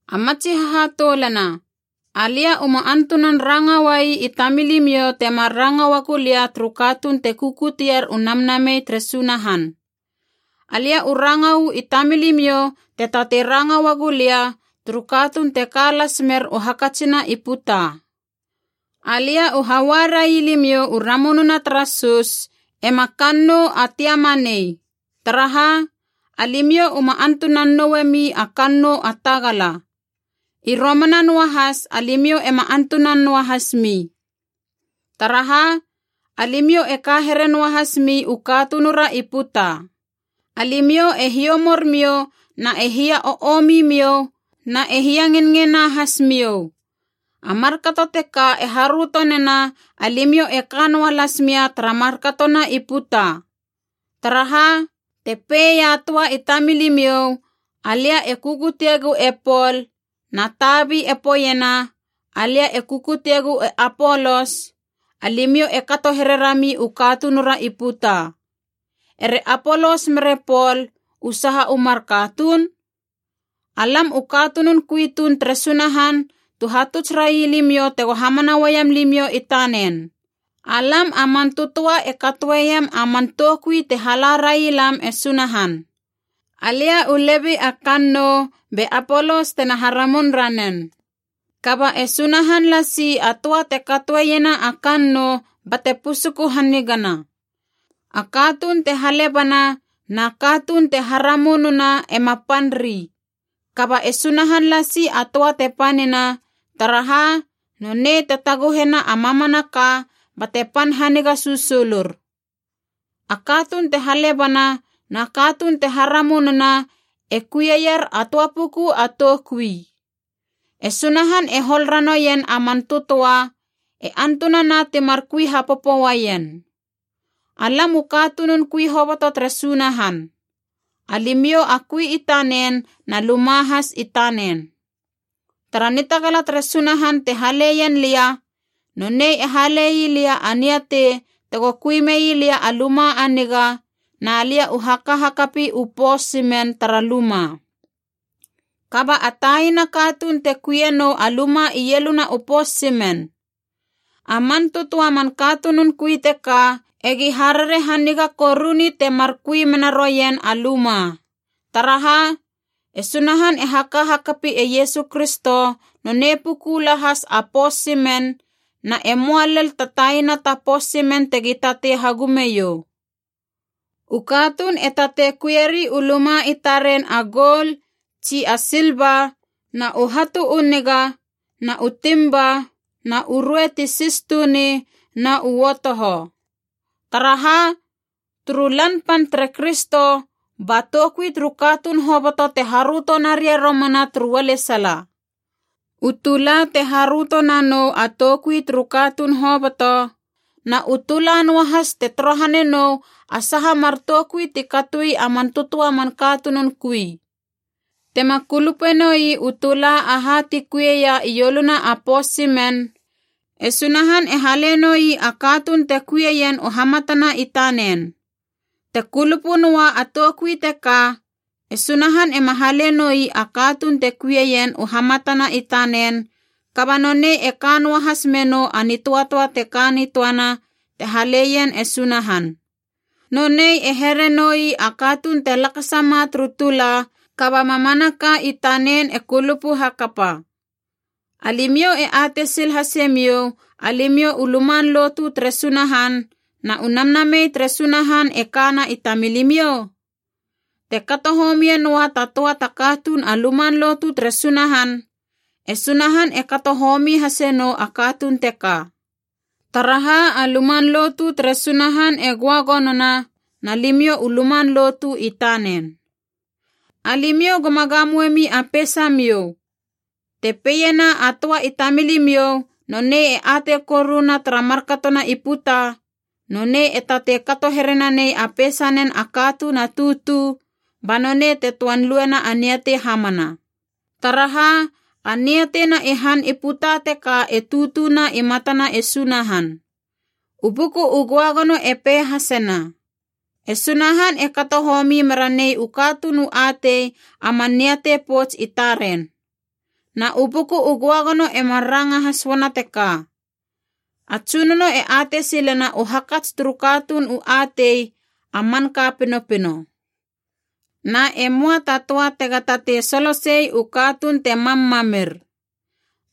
A matsi hahatoulana, alia uma antunan ranga uai i tamilimiou temar ranga uagu lia turu katuun te kukutier u Namnamei tere Sunahan. Alia u ranga uu i tamilimiou te tatei ranga uagu lia turu katuun te ka las mer u hakatsina i puta. Alia u haua railimiou u ramununa tara sus, ema kannou a tiama nei. Taraha, alimiou uma antunan nou noe mi a kannou a tagala.a I romana noahas alimiou ema antuna noahas mi. Taraha, alimiou e ka here noahas mi u katunura i puta. Alimiou e hiomor miou na e hia o omi miou na e hiangenngena hasmiou. A markato teka e haröto nena alimiou e ka noa las mia tara markatona i puta. Taraha, te pei a töa i tamilimiou, “Alia e kukuteiegu e Pol” na tabi e poeiena, “Alia e kukuteiegu e Apolos,” alimiou e kato here rami u katunura i puta. Ere Apolos mere Pol, u saha u mar katuun? Alam u katunun kui tuun tere Sunahan tu hatuts railimiou tego hamana uaiam limiou i tanen. Alam a man tötöa e katoeiem a man toukui te hala railam e Sunahan. Alia u lebi a kannou be Apolos tena haramun ranen. Kaba e Sunahan lasi a töa te katoeiena a kannou bate pusuku hanigana. A katuun te halebana, na katuun te haramununa ema pan ri. Kaba e Sunahan lasi a töa te panina, taraha nonei te taguhena a mamanaka bate pan haniga susulur. A katuun te halebana na katuun te haramununa e kuieier a töa puku a toukui. E Sunahan e hol ranoien a man tötöa, e antunana timar kui hapopo uaien. Alam u katunun kui hoboto tere Sunahan. Alimiou a kui i tanen na luma has i tanen. Tara nitagala tere Sunahan te haleien lia, nonei e hale ii lia a niatei tego kui mei lia a luma a niga, na lia u haka hakapi u pos simen tara luma. Kaba a taina katuun te kuienou a luma ieluna u pos simen. A man tötöa man katunun kui teka egi harare haniga koruni temar kui menaroien a luma. Taraha, e Sunahan e haka hakapi e Iesu Kristo, nonei puku lahas a pos simen, na e möa lel ta taina ta pos simen tegi tatei hagumeiou. U katuun e tatei kuieri u luma i taren a goul tsi a silva na u hatu u niga, na u timba na u rue ti sis tuni na uotoho. Taraha, turu Lan Pan tere Kristo, ba toukui turu katuun hoboto te haröto naria romana turu ualesala. U tula te haröto nanou a toukui turu katuun hoboto, na u tula noahas te torohane nou a saha mar toukui ti katoi a man tötöa man katunun kui. Tema kulupenoi u tula aha ti kuieia ioluna a pos simen, e Sunahan e hale noi a katuun te kuieien u hamatana i tanen. Te kulupu noa a toukui teka, e Sunahan ema hale noi a katuun te kuieien u hamatana i tanen, kaba nonei e ka noahas menou a nitöatöa te ka nitöana te haleien e Sunahan. Nonei e here noi a katuun te lakasama turu tula kaba mamanaka i tanen e kulupu hakapa. Alimiou e atei sil hase miou alimiou u luman lotu tere Sunahan na u Namnamei tere Sunahan e kana i tamilimiou? Te kato homie noa ta töa ta katuun a luman lotu tere Sunahan, e Sunahan e kato homi hase nou a katuun teka. Taraha a luman lotu tere Sunahan e göagonona, na limiou u luman lotu i tanen. Alimiou goma gamoemi a peisamiou. Te peiena a töa i tamilimiou nonei e atei koruna tara markatona i puta, nonei e tatei kato here nanei a peisanen a katuun a tutu, ba nonei te töan luena a niatei hamana. Taraha, a niateina i han i puta teka e tutuna i matana e Sunahan. U Buku u Göagono e pei hasena, “E Sunahan e kato homi mera nei u katuun u atei a man niatei pouts i taren.” Na u Buku u Göagono e mar ranga has uana teka, “A Tsunono e atei silena u hakats turu katuun u atei, a manka pinopino.” Na e möa ta töa tega tatei solosei u katuun te mam mamir.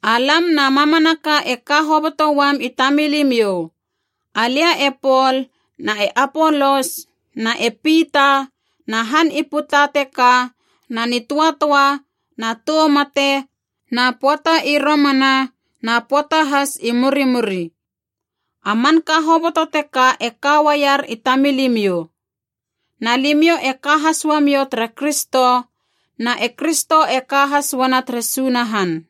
Alam na mamanaka e ka hoboto uam i tamilimiou, alia e Pol na e Apolos na e Pita na han i puta teka na nitöatöa na tou mate na pöata i romana na pöata has i murimuri. A manka hoboto teka e ka uaier i tamilimiou. Na limiou e ka has uamiou tere Kristo, na e Kristo e ka has uana tere Sunahan.